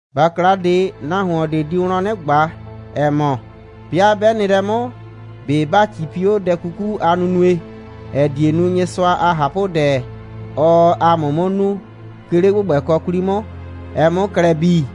‑Bakla ꞊de, nahuon ꞊de di wlɔn 'nɩ ꞊gba, ‑ɛ mɔ: «'Bɩa 'bɛ nɩ lɛ 'mʋ, ꞊be ‑ba 'cipi 'o dɛ 'kuku a nunue, ‑ɛ die nu, Nyɩsʋa a ꞊hapʋdɛ, ɔɔ ‑a mʋ 'mʋ nu, 'ke 'le ‑gbʋgbɛkɔ 'kwli 'mʋ, ɛ 'mʋ klɛ bii?»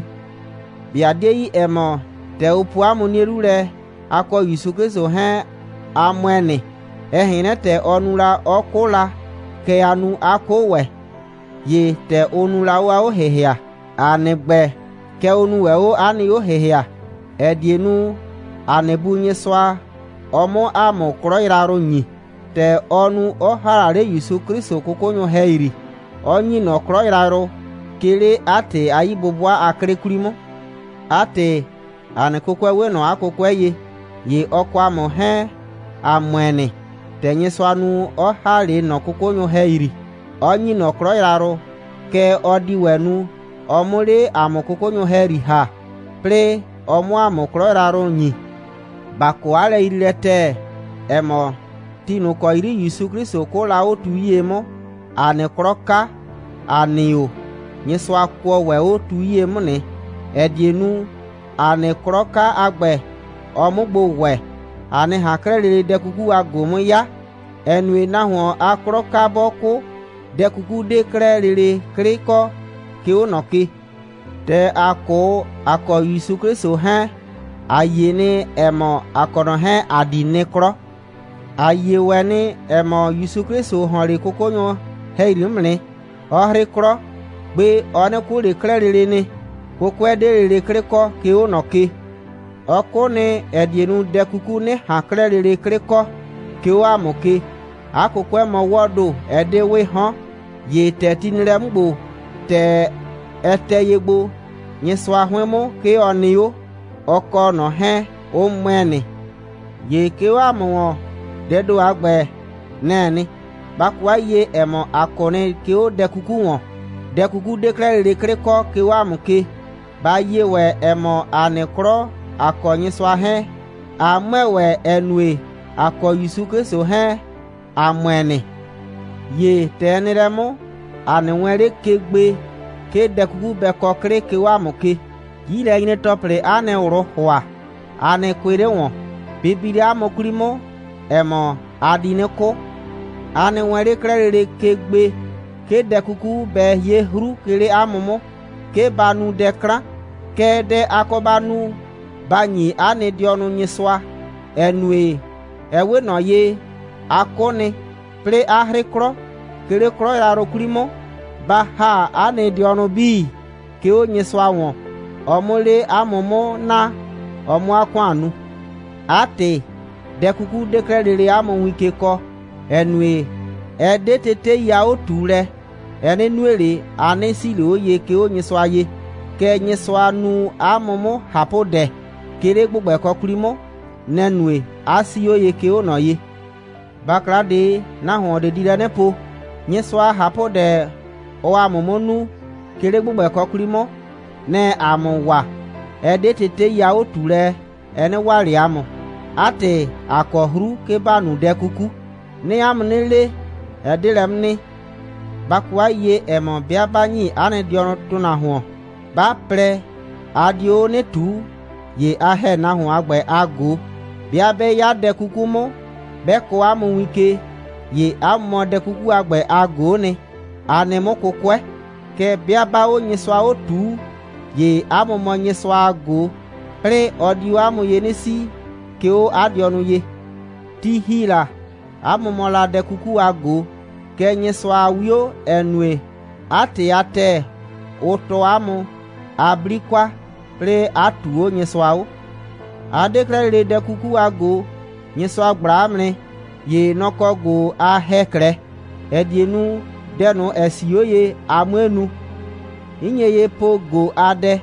꞊Be a 'die yi, ‑ɛ mɔ, ‑tɛ ʋ po ‑a mʋ 'nie 'lu lɛ, ‑a kɔ ‑Yusu 'Klɩsʋ 'hɛɛn, ‑a ‑mʋɛ nɩ. Ɛ ꞊hɛn 'nyrɛ, ‑tɛ ɔ nu la, 'ɔ 'kʋ la, kɛ ‑a nu, ꞊a 'kʋ ‑wɛ. ‑Ye ‑tɛ ʋ nu la 'o 'a 'o‑hɩhɩa, ‑a nɩ ‑gbɛ, kɛ ʋ nu ‑wɛ 'o ‑a nɩ 'o‑hɩhɩa, ‑ɛ die nu, ‑a nɩ Bu Nyɩsʋa, ɔ 'mʋ ‑a mʋ 'klɔ yrayrʋ ‑nyi, ‑tɛ ɔ nu, 'ɔ ‑ha la 'le ‑Yusu 'Klɩsʋ 'kʋkʋnyʋ ‑hɛyri, 'ɔ ‑nyi ꞊nɔ 'klɔ yrayrʋ, 'ke 'le 'a ‑tɩ a 'yi'bʋbʋa a 'klɩ 'kwli 'mʋ. 'A ‑tɩ, ‑a nɩ 'kʋkʋɛ 'we ꞊nɔ 'a 'kʋkʋɛ ye. ‑Ye ɔ kɔ ‑a mʋ 'hɛɛn, ‑a ‑mʋɛ nɩ. ‑Tɛ Nyɩsʋa nu, 'ɔ ‑ha 'le ꞊nɔ 'kʋkʋnyʋ ‑hɛyri, 'ɔ ‑nyi ꞊nɔ 'klɔ yrayrʋ, kɛ ɔ di ‑wɛ nu, ɔ 'mʋ 'le ‑a mʋ 'kʋkʋnyʋ ‑hɛyri ‑ha, 'plɩɩ ɔ 'mʋ ‑a mʋ 'klɔ yrayrʋ ‑nyi. ‑Ba kɔ 'a lɛyriilɛ ‑tɛɛ, ‑ɛ mɔ, ti ꞊nʋ ‑kɔ 'yri ‑Yusu 'Klɩsʋ 'kʋʋ la 'o tu 'yie 'mʋ, ‑a nɩ 'klɔ 'ka, ‑a nɩ o, Nyɩsʋa kʋɔ ‑wɛ 'o tu 'yie 'mʋ nɩ, ‑ɛ die nu, ‑a nɩ 'klɔ 'ka a ‑gbɛ, ɔ 'mʋ gbo ‑wɛ, ‑a 'nɩ ꞊han 'klɛɛ lele dɛ 'kuku a ꞊go 'mʋ 'ya, ‑ɛ nue, nahuon a 'klɔ 'ka 'bɔ 'kʋ, dɛ 'kuku 'de 'klɛɛ lele 'klɩ kɔ, 'ke 'o ꞊nɔ ke. ‑Tɛ ‑a 'kʋ, ‑a kɔ ‑Yusu 'Klɩsʋ 'hɛɛn, ‑a yie nɩ, ‑ɛ mɔ, ‑a kɔ ꞊nɔ 'hɛɛn, ‑a di nɩ 'klɔ. ‑A yie ‑wɛ nɩ, ‑ɛ mɔ, ‑Yusu 'Klɩsʋ ‑hɔn 'le 'kʋkʋnyʋ ‑hɛyri 'mʋ nɩ, 'ɔ 'hrɩ 'klɔ. Gbe, ɔ 'nɩ 'kʋ ꞊le 'klɛɛ lele nɩ. 'Kʋkʋɛ 'de lele 'klɩ kɔ, 'ke 'o ꞊nɔ ke. Ɔ 'kʋ nɩ, ‑ɛ die nu, dɛ 'kuku 'nɩ ꞊han 'klɛɛ lele 'klɩ kɔ, 'ke 'o ‑a mʋ ke. 'A 'kʋkʋɛ mɔ 'wɔɔ ‑do, ɛ 'de 'wɩɩ 'hɔn. ‑Ye ‑tɛ ti nɩ lɛ 'mʋ ‑gbo, ‑tɛ ɛ tɛ ye gbo, Nyɩsʋa 'hʋɩn 'mʋ, 'ke ɔ nɩ 'o. Ɔ kɔ ꞊nɔ 'hɛɛn, ʋ ‑mʋɛ nɩ. ‑Ye 'ke 'o 'a mʋ ‑wɔn, dɛɛ ‑do a ‑gbɛ, nɛ‑ɛ nɩ. Ba kɔ 'a yiyie, ‑ɛ mɔ, a 'kʋ nɩ, 'ke 'o dɛ 'kuku ‑wɔn. Dɛ 'kuku 'de 'klɛɛ lele 'klɩ kɔ, 'ke 'o 'a mʋ ke. Ba yie ‑wɛ, ‑ɛ mɔ, a nɩ 'klɔ, a kɔ Nyɩsʋa 'hɛɛn, 'a ‑mʋɛ ‑wɛ, ‑ɛ nue, a kɔ ‑Yusu 'Klɩsʋ 'hɛɛn, a ‑mʋɛ nɩ. ‑Ye ‑tɛ ɛ nɩ lɛ 'mʋ, a nɩ wɛɛn 'le ke gbe, 'ke dɛ 'kuku bɛ kɔ 'klɩ, 'ke 'o 'a mʋ ke. 'Yilɛnyre‑tɔplɩ, 'a nɩ ꞊wlʋʋ ‑hʋa, a nɩ kʋɩ 'le ‑wɔn. Bɩ bi 'le 'a mʋ 'kwli 'mʋ, ‑ɛ mɔ, a di 'nɩ 'kʋ. A nɩ wɛɛn 'le 'klɛɛ lele ke gbe, 'ke dɛ 'kuku bɛ 'ye 'hru, 'ke 'le 'a mʋ 'mʋ, 'ke ba nu dɛ 'klan. Kɛɛ, dɛ, a kɔ ba nu, ba ‑nyi 'a nɩ dɩɔnʋ Nyɩsʋa, ‑ɛ nue, ɛ 'we ꞊nɔ ye, a 'kʋ nɩ, 'plɩɩ 'a 'hrɩ 'klɔ, 'ke 'le 'klɔ yrayrʋ 'kwli 'mʋ. Ba ‑ha 'a nɩ dɩɔnʋ 'bii, 'ke 'o Nyɩsʋa ‑wɔn, ɔ 'mʋ 'le 'a mʋ 'mʋ naa, a 'mʋ 'a ‑kʋan nu. 'A ‑tɩ, dɛ 'kuku 'de 'klɛɛ lele 'a mʋ win ke kɔɔ, ‑ɛ nue, ɛ 'de tetei a 'o꞊tuulɛ, ɛ 'nɩ nue ꞊le, a 'nɩ 'sii ꞊le 'o ye, 'ke 'o Nyɩsʋa ye. Kɛɛ, Nyɩsʋa nu 'a mʋ 'mʋ ꞊hapʋdɛ, 'ke 'le ‑gbʋgbɛkɔ 'kwli 'mʋ. Nɛ‑ nue, 'a 'sii 'o ye, 'ke 'o ꞊nɔ ye. ‑Bakla ꞊de, nahuon ꞊de di lɛ 'nɩ po: «Nyɩsʋa a ꞊hapʋdɛ, ɔɔ ‑a mʋ 'mʋ nu, 'ke 'le ‑gbʋgbɛkɔ 'kwli 'mʋ, nɛ‑ɛ ‑a mʋ waa, ɛ 'de tetei a 'o꞊tuulɛ, ɛ 'nɩ waa ꞊le ‑a mʋ. 'A ‑tɩ, ‑a kɔ 'hru, 'ke ‑ba nu dɛ 'kuku.» 'Nɩɩ 'a mʋ 'nɩ le: Ɛ 'de lɛ 'mʋ nɩ. Ba kɔ 'a yiyie, ‑ɛ mɔ, 'bɩa 'ba ‑nyi 'a nɩ dɩɔnʋ nahuon, 'ba plɛ, a dio 'o 'nɩ ꞊tuu, ‑ye a ‑hɛ nahuon a ‑gbɛ a ꞊go. 'Bɩa 'bɛ 'ya dɛ 'kuku 'mʋ, 'bɛ kɔɔ 'a mʋ win ke, ‑ye 'a mʋ mɔ dɛ 'kuku a ‑gbɛ a ꞊go'o nɩ, a nɩ 'mʋ 'kʋkʋɛ. Kɛɛ, 'bɩa 'baa 'o Nyɩsʋa 'o ꞊tuu, ‑ye 'a mʋ mɔ Nyɩsʋa a ꞊go, 'plɩɩ ɔ di 'o 'a mʋ ye 'nɩ 'sii, 'ke 'o 'a dɩɔnʋ ye. Ti ‑hi la, 'a mʋ mɔ la dɛ 'kuku a ꞊go. Kɛɛ, Nyɩsʋa a 'wio, ‑ɛ nue, 'a ‑tɩ a ‑tɛɛ, ʋ tɔɔ 'a mʋ, a 'bli kwa, 'plɩɩ 'a ꞊tuu 'o Nyɩsʋa 'o. A 'de 'klɛɛ lele dɛ 'kuku a ꞊go. Nyɩsʋa ꞊gbla 'a mʋ nɩ. ‑Ye nɔ‑ kɔ ꞊go a ‑hɛ 'klɛɛ, ‑ɛ die nu, dɛ ꞊nʋ, ‑ɛ 'sii 'o ye, a 'mue nu. 'N nye ye po ꞊go a dɛ,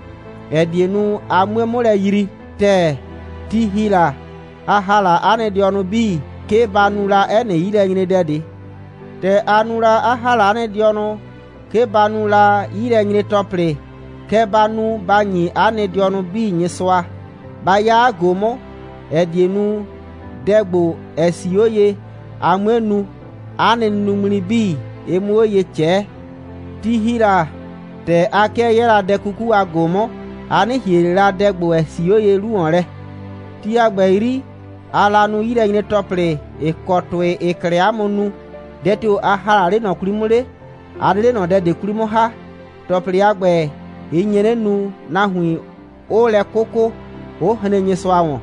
‑ɛ die nu, a 'mue 'mʋ lɛ yrii ‑tɛɛ. Ti ‑hi la, a ‑ha la 'a nɩ dɩɔnʋ 'bii, 'ke ba nu la 'ɛ nɩ 'yilɛnyredɛ ꞊de. ‑Tɛ a nu la, 'a ‑ha la 'a nɩ dɩɔnʋ, 'ke ba nu la 'yilɛnyre‑tɔplɩ, kɛ ba nu, ba ‑nyi 'a nɩ dɩɔnʋ 'bii Nyɩsʋa, ba 'ya 'a ꞊go 'mʋ, ‑ɛ die nu, dɛ ‑gbo, ‑ɛ 'sii 'o ye, a 'mue nu, 'a nɩ nunuŋmli 'bii, ɩ 'mʋ 'o ye ꞊cɛɛ. Ti ‑hi la, ‑tɛ a 'kɩɛ 'yɛɛ la dɛ 'kuku a ꞊go 'mʋ, a 'nɩ ‑hie ꞊le la dɛ ‑gbo, ‑ɛ 'sii 'o ye 'lu ‑wɔn lɛ. Ti a ‑gbɛ 'yri, aa la nu 'yilɛnyre‑tɔplɩ, ‑ɩ kɔ ‑tʋɩ, ‑ɩɩ 'klɛɛ 'a mʋ nu. Dɛ tio‑ a ‑ha 'le ꞊nɔ 'kwli 'mʋ 'le? A 'de 'le ꞊nɔ dɛ ꞊de 'kwli 'mʋ ‑ha. ‑Tɔplɩ a ‑gbɛ, ɩ nye 'nɩ nu, nahuin 'ʋʋ lɛ 'kʋkʋ, 'ʋ hren Nyɩsʋa ‑wɔn.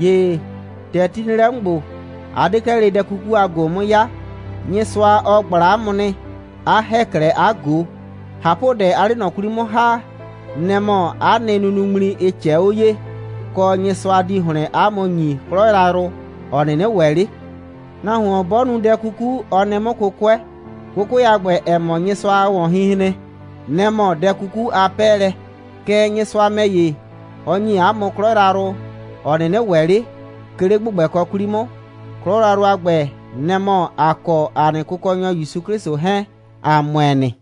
‑Ye ‑tɛ ti nɩ lɛ 'mʋ ‑gbo, a 'de 'klɛɛ lele dɛ 'kuku a ꞊go 'mʋ 'ya. Nyɩsʋa, ɔ ꞊gbla 'a mʋ nɩ, 'a ‑hɛ 'klɛɛ 'a ꞊go. ꞊Hapʋdɛ, aa 'le ꞊nɔ 'kwli 'mʋ ‑ha, nɛ‑ mɔ 'a nɩ nunuŋmli, ɩ ꞊cɛɛ 'o ye, kɔ, Nyɩsʋa di ‑hlɩn 'a mʋ ‑nyi 'klɔ yrayrʋ, ‑ɔ 'nɩnɩ ‑wɛ 'le. Nahuon 'bɔ nu dɛ 'kuku, ɔ nɩ 'mʋ 'kʋkʋɛ. 'Kʋkʋɛ a ‑gbɛ, ‑ɛ mɔ Nyɩsʋa a ‑wɔnhinhren, nɛ‑ mɔ dɛ 'kuku a 'pɛɛlɛ. Kɛɛ, Nyɩsʋa ‑mɛ ‑ye, ɔ ‑nyi ‑a mʋ 'klɔ yrayrʋ, ‑ɔ 'nɩnɩ ‑wɛ 'le, 'ke 'le ‑gbʋgbɛkɔ 'kwli 'mʋ. 'Klɔ yrayrʋ a ‑gbɛ, nɛ‑ mɔ, ‑a kɔ ‑a nɩ Kʋkɔnyɔ ‑Yusu 'Klɩsʋ 'hɛɛn, ‑a ‑mʋɛ nɩ.